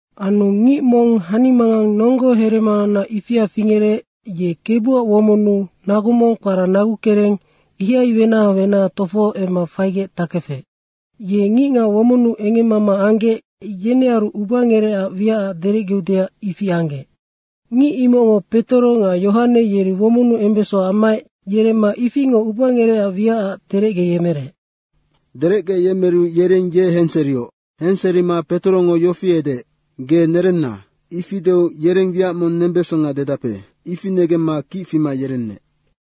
Anu ngic mong hanimangang nonggo heremanaunac ifia fingerec, ye Kebuac womonnu nagu mong kpara Nagukereng, ihai wenaha wenaha tofoho emma faigec takefec. Ye ngicngac womonnu engemmama anggec, yenearu ubangerecac wiacac derecgeudeac ifi anggec. Ngic imocngo Petoro nga Yohane yeri womonnu embeso ammaec yeremma ifingoc ubangerecac wiacac derecgeyemerec. Derecgeyemeru yereng ye henserioc. Henserima Petorongo yofi edeec, “Ge nerenna!” Ifi deu “Yereng wiac mong nembesonga dedape.” ifi negemma kic fima yerenec.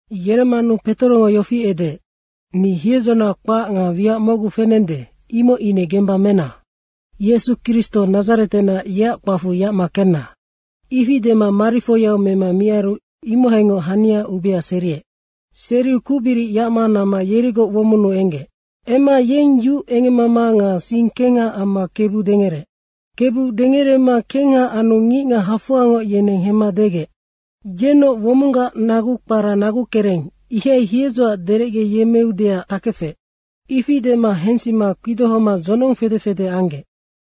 Yeremmanu Petorongo yofi edeec, “Ni hiedzona kpac nga wiac mocgu fenende, imoc ine gemba mena! Yesu Kristo Nadzaretenac, yeac kpacfu yacma kenna.” Ifi dema marifoiau mema miaru imohaingoc hania ubea seriec. Seriu kucbiric yacma namma yerigoc womonnu enggec. Emma yeng yu engemmama nga sing kengha amma Kebu dengereec. Kebu dengerema kengha anu ngicngac hafoangoc yeneng hemma degec. “Yennoc womonggac nagu kpara Nagukereng, ihai hiedzoac derecgeyemmeudeac takefec.” Ifi dema hensima kpidohoma dzonong fede fede anggec.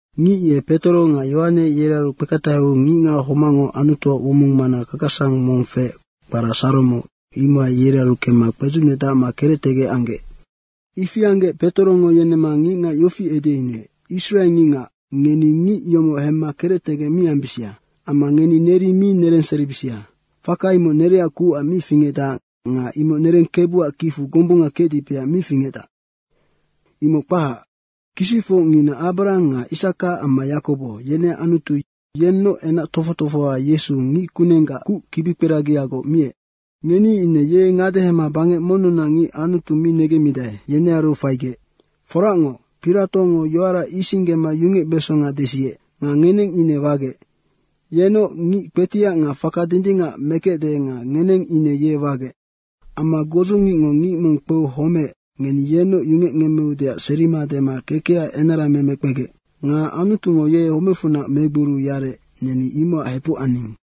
Ngic ye Petoro nga Yohane yerearu kpeketaheu ngicngac homacngo Anutuac womong mana kakasang mong feec, kpara Saromo, imohai yerearu kemma kpedzucnedacma kerectegec anggec. Ifi anggec Petorongo yenemma ngicngac yofi edeyunuec, “Israe ngicngac, ngeni ngic yomoc hemma kerectegec mi ambisia. Amma ngeni neri mi nerenseribisia. Faka imoc nereac kucac mi fingecdac nga imoc nereng Kebuac kicfu gombunga kecdipeac mi fingecdac. Imoc kpahac, kisicfocngina Abrahang nga Isaka amma Yakobo, yeneac Anutu yennoc enac tofoc tofohoa Yesu ngickunenggac kuc kibikperagiagoc miec. Ngeni ine ye ngadehema bangec monnunac ngic Anutu mi negemmidae, yenearu faigec. Foracngoc, Piratongo yoara isinggema yungecbesonga desiec. Nga ngeneng ine wagec. Yenoc ngic kpetiac nga faka dindingac mekecde nga ngeneng ine ye wagec. Amma godzungicngo ngic mong kpeu homeec, ngeni yenoc yungecngemmeudeac serima dema kekecac enarameme kpegec. Nga Anutungo ye homecfunac megboriu yarec, neni imocac hepuc aning.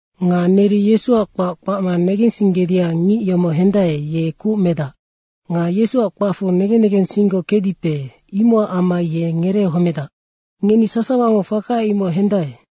Nga neri Yesuac kpac kpacma negensinggedicac ngic yomoc hendae, ye kuc medac. Nga Yesuac kpacfu negen negensinggoc kecdipe, imocac amma ye ngereehomedac. Ngeni sasawango faka imoc hendae.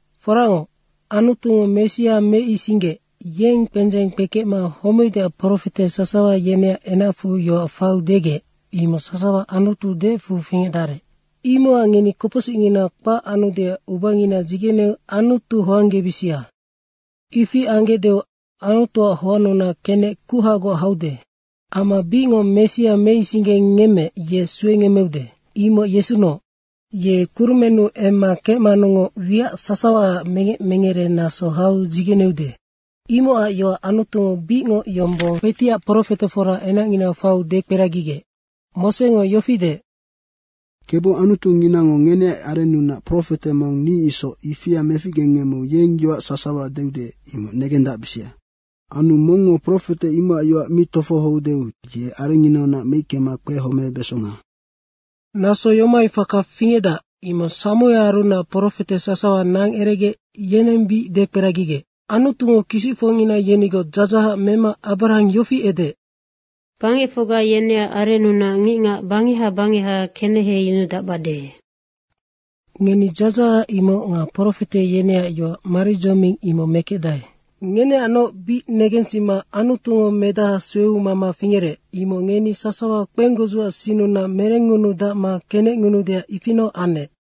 Foracngoc, Anutungo Messia meisinggeec, yeng kpendzeng kpekecma homeudeac profete sasawa yeneac enacfu yoac faiu degec, imoc sasawa Anutu deecfu fingecdarec. Imocac ngeni kopocsicngina kpac anudeac ubangina dzigeneu Anutu hoanggebisia. Ifi anggecdeu Anutuac hoannunac kenec kuhagoc haude. Amma bicngoc Messia meisinggengemmeec, ye suengemmeude, imoc Yesunoc. Ye kurumennu emma kecmanungoc, wiac sasawaac mengec mengere naso hau dzigeneude. Imocac yoac Anutungo bicngoc yombong kpetiac profetefora enacnginau faiu dekperagigec. Mosengo yofi deec, ‘Kebu Anutunginango ngeneac arennunac profete mong ni isoc, ifia meficgengemmeu yeng yoac sasawa deude, imoc negendacbisia. Anu mongngo profete imocac yoac mi tofohoudeu ye arengnginaunac meickema kpehomebesonga.’ Naso yomohai faka fingecdac, imoc Samuearunac profete sasawa nangeregec, yeneng bic dekperagigec. Anutungo kisicfocngina yenigoc dzadzahac mema Abrahang yofi edeec, ‘Bangecfocga yeneac arennu ngicngac bangeha bangeha keneheyunudacbade.’ Ngeni dzadzahac imoc nga profete yeneac yoac maridzoming imoc mekecdae. Ngeneacnoc bic negensima Anutungo medaha sueu mama fingerec, imoc ngeni sasawa kpenggodzuac sinnunac merengngunudacma kenecngunuudeac ifinoc anec.”